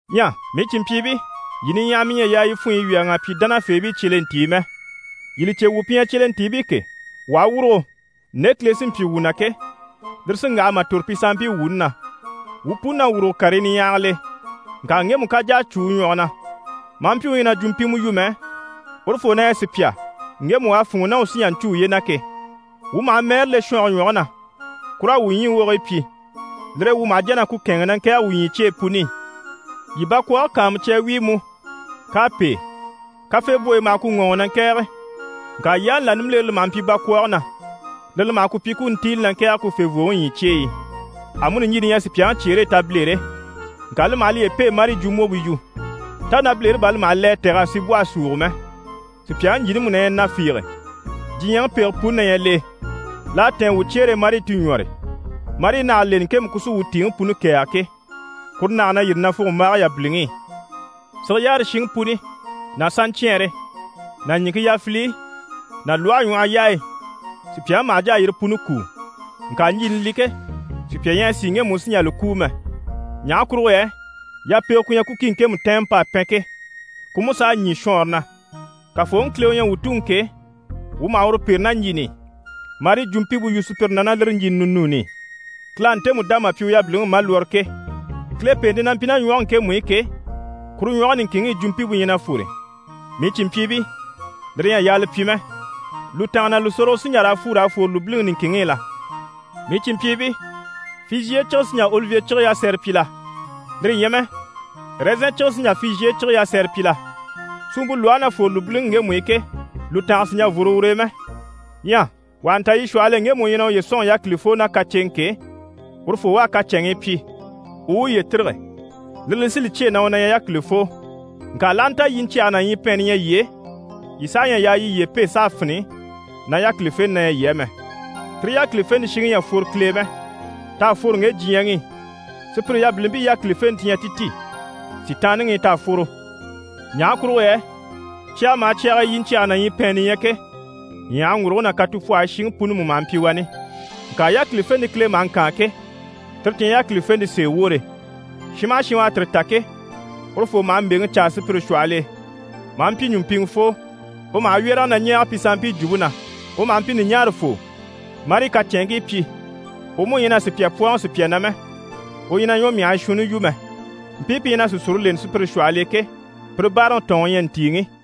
Ɲyɛ mii cìnmpyiibii, yii niɲyahamii ɲyɛ a yaa yii funɲyi wyɛ̀rɛŋ'a pyi dánafeebii cyelentii mɛ. Yii li cè, wuu pi ɲyɛ cyelentiibii ke, wuu aha wurugo, nde Kile sí n‑pyi wuu na ke, lire sí n‑waha mà tòro pi sanmpii wuuni na. Wuu puni na wuruge karii niɲyahagil'e, ŋka ŋgemu ká jà a cû u ɲwɔge na, maa mpyi u ɲyɛ na jwumpimɛ yu mɛ, urufoo na ɲyɛ sùpya ŋgemu u à fûnŋɔ ná u sí n‑jà n‑cû uye na ke. Wuu maha mɛɛre le shɔnge ɲwɔge na ku raa wuu ɲyii wogigii pyi. Lire e wuu maha jà na ku kɛ̂ɛnŋi na ŋkɛ̀ɛge wuu ɲyii cyeyi puni i. Yii bakwɔɔge kàanmucya a wíi mú, k'à pêe, kafeebwoyi maha ku ŋɔɔŋi na ŋkɛ̀ɛge. Ŋka yaani là nimbilere li maha mpyi bakwɔɔge na, lire li maha ku pyi ku u ntíili na ŋkɛ̀ɛge ku fèvooŋi ɲyii cyeyi i. Amuni ɲjini ɲyɛ sùpyaŋi cyeere e tabilere. Ŋka li maha liye pêe marii jwumbwompe yu. Tá nabilere bà li maha le a tɛ̀g'a sibwɔhe súugo mɛ? Sùpyaŋi ɲjini mú na ɲyɛ na fiige. Diɲyɛŋi pege puni na ɲyɛ l'e, l'à tɛ̀ɛn wuu cyeere e, marii ti puni ɲwɔ́re, marii nage leni, ŋkemu ku sí wuu tìiŋi puni kɛ̀ɛge ke, kuru nage na yîri nafugombaage yabiliŋi i. Sige yaare shiŋi puni ná saɲcɛɛnre ná ɲìŋke yafiliyi ná lwɔhe ɲwɔhɔ yaayi, sùpyaŋi maha jà a yire puni kúu. Ŋka ɲjini li ke, sùpya ɲyɛ a sìi ŋgemu u sì n‑jà li kúu mɛ. Ɲaha kurugo yɛ yapege ku ɲyɛ ku ki, ŋkemu tɛɛnmɛ p'à pɛn ke, ku mú s'à ɲî shɔɔnre na. Kafooŋi Kile u ɲyɛ wuu Tuŋi ke, wuu maha uru pêre ná ɲjini i, marii jwumpimpe yu sùpyire na ná lire ɲjini ninuuni i, Kile à ntemu dá mà pyi u yabiliŋi malwɔrɔ ke. Kile pèente na mpyi ná ɲwɔge ŋkemu i ke, kuru ɲwɔge niŋkinŋi i jwumpimpe ɲyɛ na fwore. Mii cìnmpyiibii, lire ɲyɛ a yaa li pyi mɛ. Lùtanga ná lùsorogo sí n‑jà raa fwu raa fwore lùbiliŋi niŋkinŋi i la? Mii cìnmpyiibii, fizhiye cige sí n‑jà olivye cige yasɛrɛ pyi la? Lire ɲyɛ mɛ, ɛrɛzɛn cige sí n‑jà fizhiye cige yasɛrɛ pyi la? Suumpe lwɔhe na fwore lùbiliŋi ŋgemu i ke, lùtanga sì n‑jà n‑fworo ur'e mɛ. Ɲyɛ wà ha nta yii shwɔhɔl'e ŋgemu u ɲyɛ na uye sɔ̂nŋi yákilifoo ná kaceŋɛ ke, urufoo u a kacɛnŋii pyi, u u uye tîrige, lire li sí li cyêe na u na ɲyɛ yákilifoo. Ŋka l'aha nta yiɲcyɛge ná ɲyipɛɛnni ɲyɛ yii e, yii saha ɲyɛ a yaa yii yiye pêe s'a fini na yákilifenɛ na ɲyɛ yii á mɛ. Tire yákilifente shiŋi ɲyɛ a fworo Kile e mɛ. T'à fworo ŋge diɲyɛŋi i. Sùpyire yabilimpii yákilifente ti ɲyɛ ti ti, Sitaanniŋi i t'à fworo. Ɲaha kurugo yɛ cyaga maha cyag'e yiɲcyɛge ná ɲyipɛɛnni ɲyɛ ke, ɲyàhaŋguruguŋi ná katupwɔhɔyi shiŋi puni mú maha mpyi wani. Ŋka yákilifente Kile maha ŋkaan ke, tire ti ɲyɛ yákilifente sèe woore. Shin maha shin u à tire ta ke, urufoo maha mbèŋi caa sùpyire shwɔhɔl'e, maa mpyi ɲùmpiŋɛfoo, u maha wyɛrɛge na ɲɛɛge pi sanmpii jwumpe na, u maha mpyi ɲùɲaarafoo, marii kacɛnŋkii pyi, u mú ɲyɛ na sùpya pwɔ́ɔŋi sùpya na mɛ, u ɲyɛ na ɲwɔmyahii shuunni yu mɛ. Mpii pi ɲyɛ na sìsure leni sùpyire shwɔhɔl'e ke, pire báaraŋi tɔ̀ɔnŋi u ɲyɛ ntìiŋi.